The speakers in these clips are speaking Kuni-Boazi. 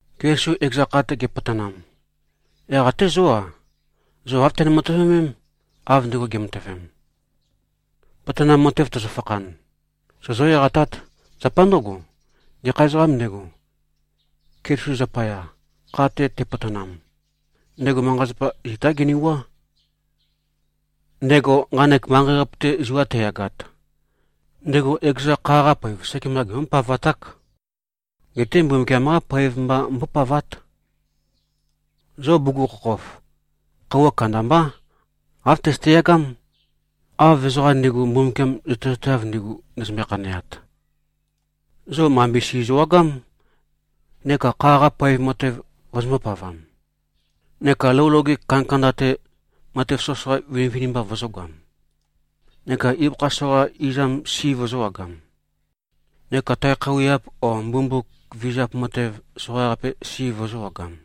Keliso ekeza kha-te gepotonam, yaq até zó-a, zo āv tøne-matøvemém, av ndego ge꞉matøvem. Potonam matev tøzøfakhan, sozó-eqatát. Zapa ndǿgo, gekha ezoqām ndego, Keliso zapaya, kha-te tepotonam, ndego manqa-zapa, zitá genewuá. Ndego nqanek manqei-qape-te zua teyagat, ndego ekeza kha-qa poev sekemba gembó-pavaták. Geté Mbumbukiam-qá poev mba mbópavát. Zo bugukhokhof, khøuwa kandambá, āv tøzøte-yagám, av ezoqa ndi꞉gu, Mbumbukiam zøtezateav ndigu, ndezømbe-khaneat. Zo mambe si zøwagám, neka kha-qa poev matev vozombō-pavam, neka lou loge kandakanda-te, matev soqøsoqa vinivinimba vozōgoam, neka ibøkha soqa izam si, vøzø̄wagam, neka tae khøuwiap o mbumbuk vizap matev soqaqape si, vøzø̄wagam.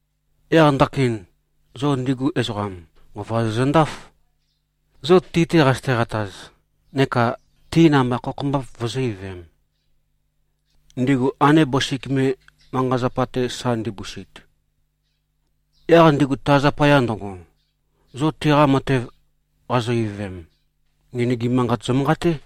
Yaq ndakin, zo ndigu ezoqam, nqova zozøndáf, zo ti-te qazøte-qataz neka ti namba khokhombap vøzø̄-ivøvem, ndigu ande bøsik me, manqa-zapa-te sa ndibusit. Yaq ndigu ta zapaya ndøgo, zo tiqa matev qazo-ivøvem, ngenøgim manqat zømanqaté.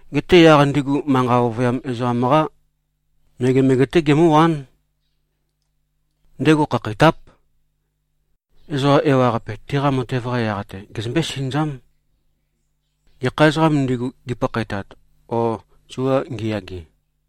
Geté yaq ndigu manqa ovøyam ezoqam-qá megemege-té gemǿwán. Ndego khakheitáp. Ezoqa ewaqape tiqa matev-qa yaq-te gezømbé-sinøzám, gekha ezoqām ndigu, gipakhaetat o zua ngiyage.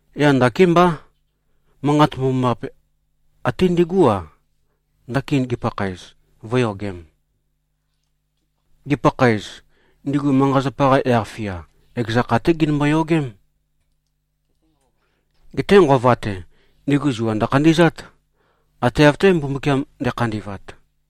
Yaq nakémbá, Manqat Mbomambaqape até ndigú-a, ndakin gipakhaez, vø̄yogem. Gipakhaez, ndigu manqa-zapa-qa yaq-fia, ekeza kha-té ginømbo-yogém. Geté nqova-te, ndigu zua ndøkhandi꞉zát, ate av-té, Mbumbukiam nde꞉khandi꞉vat.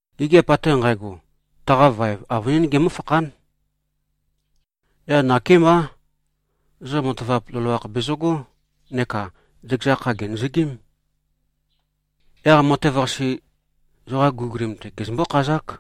Gigiap ate nqægo, taqa vaev, avønín gemǿfakhán. Yaq nakémbá, zo matavap loloakh bezøgó, neka zøkeza kha, gènøzøgím. Yaq matev-qase, zoqa guligulim-te, gezømbǿ-khazák.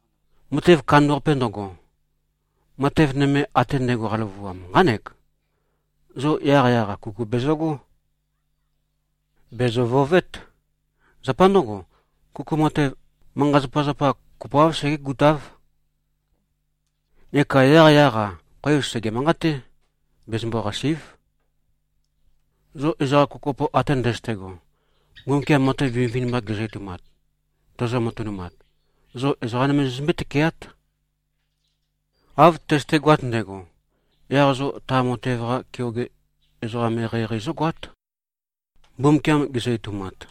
Matev kandambaqape ndøgo, matev nøme ate ndægo qaløvuam, nqánek: Zo yaqyaq-a, kuku bezøgó. Bèzø-vøovét. Zapa ndǿgo, kuku matev, manqa-zapazapa kopoáv segégutáv. Neka yaqyaq-a, khoev sège-manqaté. Bezømbo-qàsi᷄꞉v. Zo ezoqa kopokopo ate ndøzøte꞉go, Mbumbukiam matev vinivinimba gezø-etoumat, tozo-matønumat, zo ezoqa nøme zozømbé-tøkeát. Av tøzøtegoat ndægo, yaq zo ta matev-qa keoge ezoqam eqeieqei, zógoát, Mbumbukiam gezø-etoumat.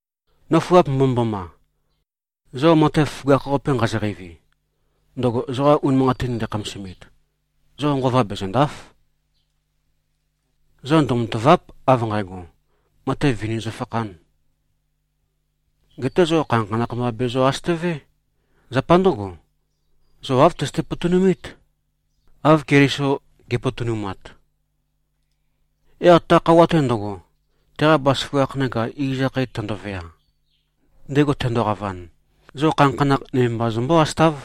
Nøfuap mbomømboma! Zo matev føgakh-qape nqazo-qeivi, ndøgo zoqa unimanqatin ndækhamasimit, zo nqova bezø̀nda᷄f. Zo ndømatàva᷄p, av nqægo, matev vini zøfakhān. Geté zo khanakhanakh mba bezø-asøtøvé. Zapa ndǿgo, zo āv tøzøte-potonumít, av Keliso ge꞉potonumat. Yaq ta khøuwa-te ndøgo, teqa bazaføgakh neka iz akhae tøndovea, ndego tendoqavan, zo khanakhanakh nøme mba zømbǿ-asøtáv.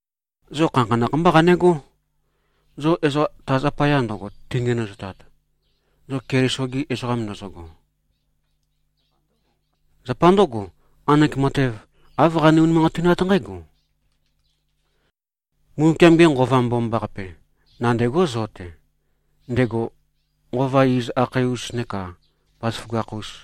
Zo khanakhanakh mbá qanegó, zo ezoqa ta zapaya ndøgo tingenøzotat, zo Keliso-gi ezoqam ndozogo. Zapa ndǿgo, nqanek matev, āv qane-unimanqatinát nqǽgo: Mbumbukiam-ge Nqova Mbomambaqape, nandêgó zo-te, ndego Nqova iz akhae-us neka bazaføgakh-us.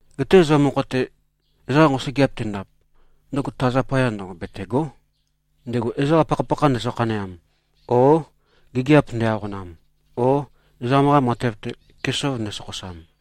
Geté zo mokho-te, ezoqa nqosøgeap tendap, ndøgo ta zapaya ndøgo betègo᷄, ndego ezoqa pakhapakha ndezø-khaneam o gigiap nde-aqonam o ezoqam-qa matev-te, kesov ndesokhosam.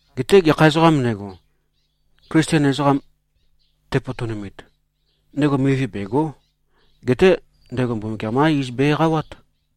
Geté gekha ezoqām ndego, Klisten ezoqam tepotonumit, ndego mivi bègo᷄. Geté ndego Mbumbukiam-qá iz be-eqawát.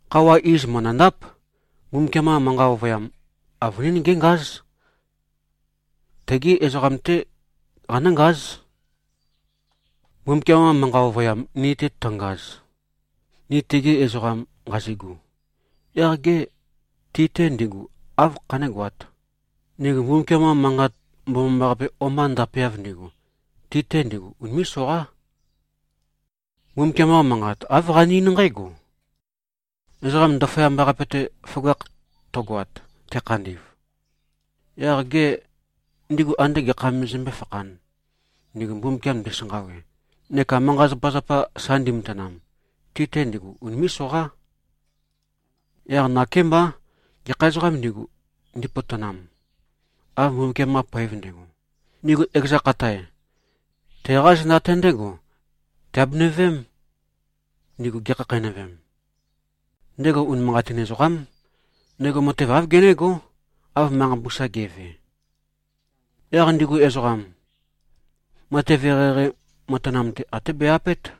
Khøuwa iz mø̀ndøndáp. Mbumbukiam-qa manqa ovøyam, avønín géngáz. Tegi ezoqam-té qanǿngáz. Mbumbukiam-qa manqa ovøyam ni-te tøngaz, ni tegi ezoqam nqazigu, yaq gê, ti-te ndigu áv khanégoāt, ndigu Mbumbukiam-qa Manqat Mbomambaqape o-mba ndapeav ndigu? Ti-te ndigu unimé꞉-soqá. Mbumbukiam-qa Manqat, āv qane-eín nqǽgo, “Ezoqam ndaføyamba-qape-te føgakh tøgoat, te꞉khandi꞉v, yaq gê, ndigu ande gekham me zømbé-fakhān, ndigu Mbumbukiam ndisanqawe neka manqa-zapazapa sa ndimatanam? Ti-te ndigu unimé꞉-soqá.” Yaq nakémbá, gekha ezoqām ndigu, ndipotonam, av Mbumbukiam-qa poev ndægo, ndigu ekeza khatae, teqá zenda-te ndégo tiabenø-veém, ndigu gekhakheinøvem. Ndego unimanqatin ezoqám. Ndego matev āv genégó, av manqa mbusa ge꞉ve. Yaq ndigu ezoqam, matev eqeieqei matanam-te até be-apét.